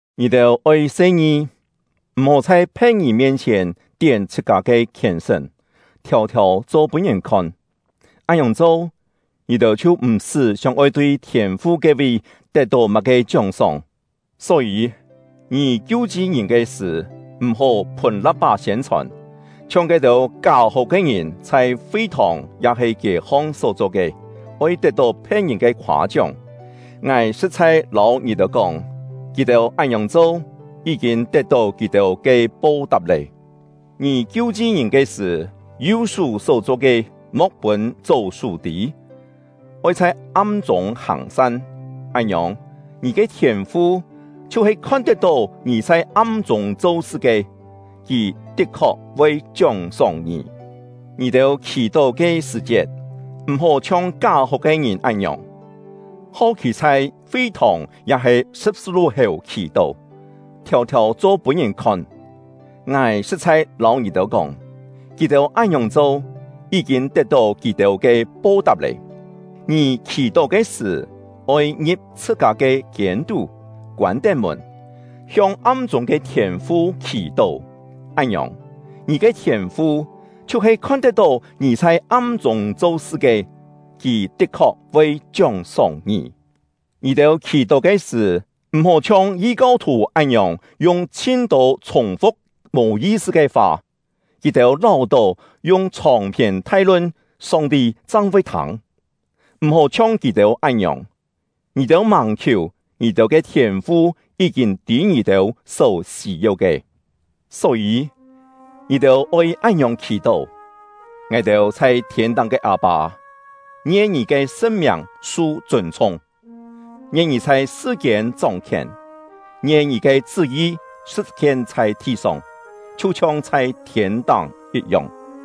“Ngì-têu oi se-ngi, m̀-hó chhai phe̍t-ngìn mien-chhièn tién chhṳ-kâ ke khièn-sṳ̀n, thiâu-thiâu cho pûn ngìn khon. Án-ngiòng cho, ngì-têu chhiu m̀-sṳ́ sióng-oi tui Thiên-fu ke-vi tet-tó má-ke chióng-sóng. “Só-yî, ngì kiu-chi ngìn ke sṳ̀, m̀-hó phùn la̍p-pá siên-chhòn, chhiong ke-têu ká-hó ke ngìn chhai fi-thòng ya-he kiê-hong só-cho ke, oi tet-tó phe̍t-ngìn ke khoâ-chióng. Ngài sṳ̍t-chhai lâu ngì-têu kóng, kì-têu án-ngiòng cho, yí-kîn tet-tó kì-têu ke po-tap lé. Ngì kiu-chi ngìn ke sṳ̀, yu-sú só-cho ke, mo̍k pûn chó-sú tî, oi chhai am-chûng hàng-san. Án-ngiòng, ngì ke Thiên-fu, chhiu-he khon-tet-tó ngì chhai am-chûng cho-sṳ ke, Kì tit-khok voi chióng-sóng ngì. “Ngì-têu khì-tó ke sṳ̀-chiet, m̀-hó chhiong ká-hó ke ngìn án-ngiòng, hau khî chhai fi-thòng ya-he sṳ̍p-sṳ-lu-héu khì-tó, thiâu-thiâu cho pûn ngìn khon. Ngài sṳ̍t-chhai lâu ngì-têu kóng, kì-têu án-ngiòng cho, yí-kîn tet-tó kì-têu ke po-tap lé. Ngì khì-tó ke sṳ̀, oi ngi̍p chhṳ-kâ ke kiên-tú, koân-tén mùn, hiong am-chûng ke Thiên-fu khì-tó. Án-ngiòng, ngì ke Thiên-fu, chhiu-he khon-tet-tó ngì chhai am-chûng cho-sṳ ke, Kì tit-khok voi chióng-sóng ngì. “Ngì-têu khì-tó ke sṳ̀, m̀-hó chhiong yi-kau-thù án-ngiòng yung chhin-tô chhùng-fu̍k mò yi-sṳ ke fa. Kì-têu láu-tó yung chhòng-phiên thai-lun, Song-ti chang voi thâng. M̀-hó chhiong kì-têu án-ngiòng; ngì-têu màng khiù, ngì-têu ke Thiên-fu yí-kîn tî ngì-têu só sî-yeu ke. Só-yî, ngì-têu oi án-ngiòng khì-tó: Ngài-têu chhai thiên-táng ke Â-pâ: Ngien Ngì ke sṳn-miàng su chûn-chhung; ngien Ngì chhai sṳ-kiên chóng-khièn; ngien Ngì ke chṳ́-yi sṳ̍t-hien chhai thi-song, chhiu-chhiong chhai thiên-táng yit-yong.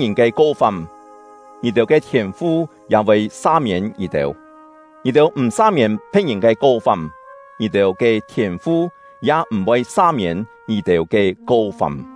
“Ngì-têu sa-miên phe̍t-ngìn ke ko-fam, ngì-têu ke Thiên-fu ya voi sa-miên ngì-têu; ngì-têu m̀ sa-miên phe̍t-ngìn ke ko-fam, ngì-têu ke Thiên-fu ya m̀-voi sa-miên ngì-têu ke ko-fam.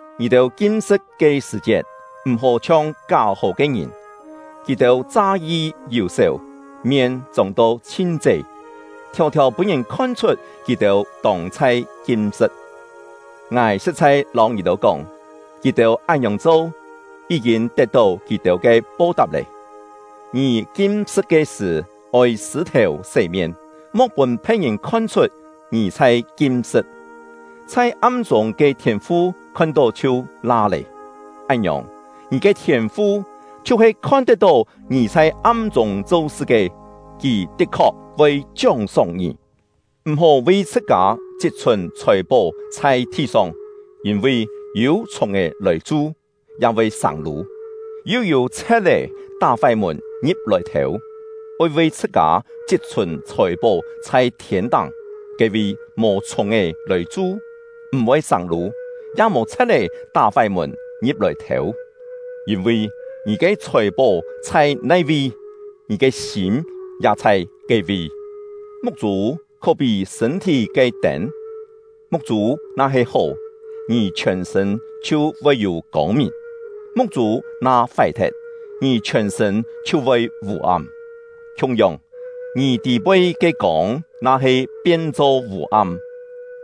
“Ngì-têu kim-sṳ̍t ke sṳ̀-chiet, m̀-hó chhiong ká-hó ke ngìn; kì-têu cha-yi yù-sèu, mien chông-to chhin ché, thiâu-thiâu pûn ngìn khon-chhut kì-têu tông chhai kim-sṳ̍t. Ngài sṳ̍t-chhai lâu ngì-têu kóng, kì-têu án-ngiòng cho, yí-kîn tet-tó kì-têu ke po-tap lé. Ngì kim-sṳ̍t ke sṳ̀, oi sṳ̂-thèu sé-mien, mo̍k pûn phe̍t-ngìn khon-chhut ngì chhai kim-sṳ̍t; chhai am-chûng ke Thiên-fu khon-tó chhiu la lé! Án-ngiòng, ngì ke Thiên-fu, chhiu-he khon-tet-tó ngì chhai am-chûng cho-sṳ ke, Kì tit-khok voi chióng-sóng ngì. “M̀-hó vi chhṳ-kâ chit-chhùn chhòi-pó chhai thi-song; yîn-vi yû chhùng-è lòi chu, ya voi sâng-lû, yu yû chhe̍t-é tá-fái mùn ngi̍p-lòi thêu. Oi vi chhṳ-kâ chit-chhùn chhòi-pó chhai thiên-táng; ke-vi mò chhùng-è lòi chu, m̀-voi sâng-lû, ya mò chhe̍t-é tá-fái mùn ngi̍p-lòi thêu. Yîn-vi ngì ke chhòi-pó chhai nai-vi, ngì ke sîm ya chhai ke-vi. “Muk-chû khó-pí sṳ̂n-thí ke tên. Muk-chû na-he hó, ngì chhiòn-sṳ̂n chhiu voi yû kông-mìn; muk-chû na fái-thet, ngì chhiòn-sṳ̂n chhiu voi vû-am. Khiung-yong, ngì tî-poi ke kông na-he pien-cho vû-am,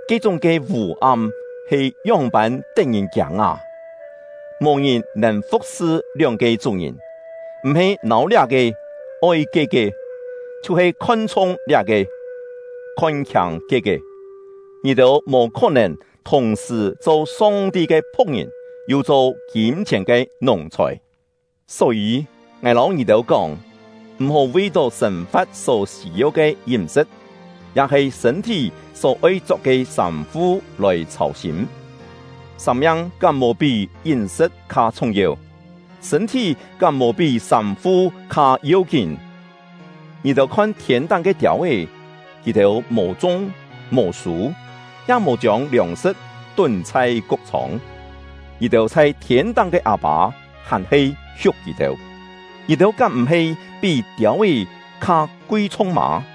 ke-chúng ke vû-am he ngióng-pân tet-ngìn-kiâng â! “Mò ngìn nèn fu̍k-sṳ lióng-ke chú-ngìn. M̀-he nâu liá-ke, oi ke-ke, chhiu-he khon-chhung liá-ke, khon-khiâng ke-ke. Ngì-têu mò khó-nèn thùng-sṳ̀ cho Song-ti ke phu̍k-ngìn, yu cho kîm-chhièn ke nùng-chhòi. “Só-yî, ngài lâu ngì-têu kóng, m̀-hó vi-tó sên-fa̍t só sî-yeu ke yím-sṳ̍t, ya-he sṳ̂n-thí só-oi chok ke sâm-fu lòi chhâu-sîm. Sâng-miang kám mò pí yím-sṳ̍t kha chhung-yeu? Sṳ̂n-thí kám mò pí sâm-fu kha yeu-kín? Ngì-têu khon thiên-táng ke tiâu-é: Kì-têu mò chung, mò sû, ya mò chiông liòng-sṳ̍t tún chhai kuk-chhông; ngì-têu chhai thiên-táng ke Â-pâ hàn-he hiuk kì-têu! Ngì-têu kám m̀-he pí tiâu-é kha kui-chhung mâ?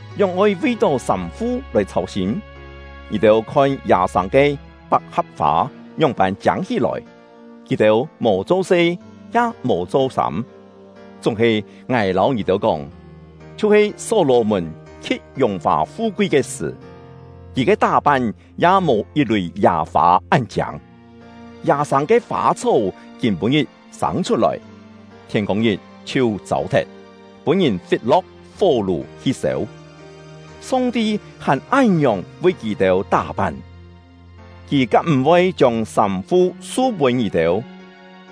“Ngióng-oi vi-tó sâm-fu lòi chhâu-sîm? Ngì-têu khon yâ-sâng ke pak-ha̍p-fâ ngióng-pân chiâng hí-lòi! Kì-têu mò cho-se, ya mò cho-sâm; chúng-he ngài lâu ngì-têu kóng, chhiu-he Só-lò-mùn khi̍t yùng-fà fu-kui ke sṳ̀, kì ke tá-pan ya mò yit-lùi yâ-fâ án-chiâng. Yâ-sâng ke fâ-chhó kîm-pû-ngit sâng chhut-lòi, thiên-kông-ngit chhiu châu-thet, pûn-ngìn fit-lo̍k fó-lù hi sêu, Song-ti hàn án-ngiòng vi kì-têu tá-pan, Kì kám m̀-voi chiông sâm-fu su-pûn ngì-têu?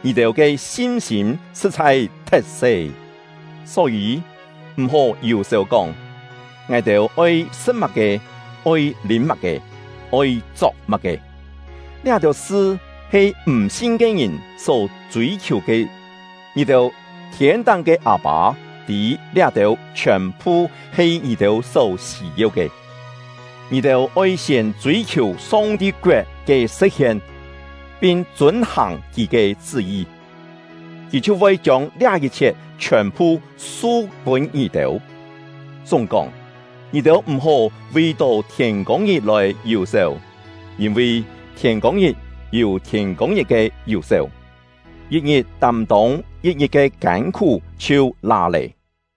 Ngì-têu ke sin-sîm sṳ̍t-chhai thet-se! Só-yî, m̀-hó yù-sèu kóng: ‘Ngài-têu oi sṳ̍t má-ke? Oi lîm má-ke? Oi chok má-ke?’ Liá-têu sṳ he m̀-sin ke ngìn só chûi-khiù ke. Ngì-têu thiên-táng ke Â-pâ tî liá-têu chhiòn-phu he ngì-têu só sî-yeu ke. Ngì-têu oi siên chûi-khiù Song-ti koet ke sṳ̍t-hien, pin chûn-hàng Kì ke chṳ́-yi, Kì chhiu voi chiông liá yit-chhiet chhiòn-phu su-pûn ngì-têu. Chúng-kóng, ngì-têu m̀-hó vi-tó thiên-kông-ngit lòi yù-sèu, yîn-vi thiên-kông-ngit yû thiên-kông-ngit ke yù-sèu; yit-ngit tâm-tông yit-ngit ke kân-khú chhiu la lé.”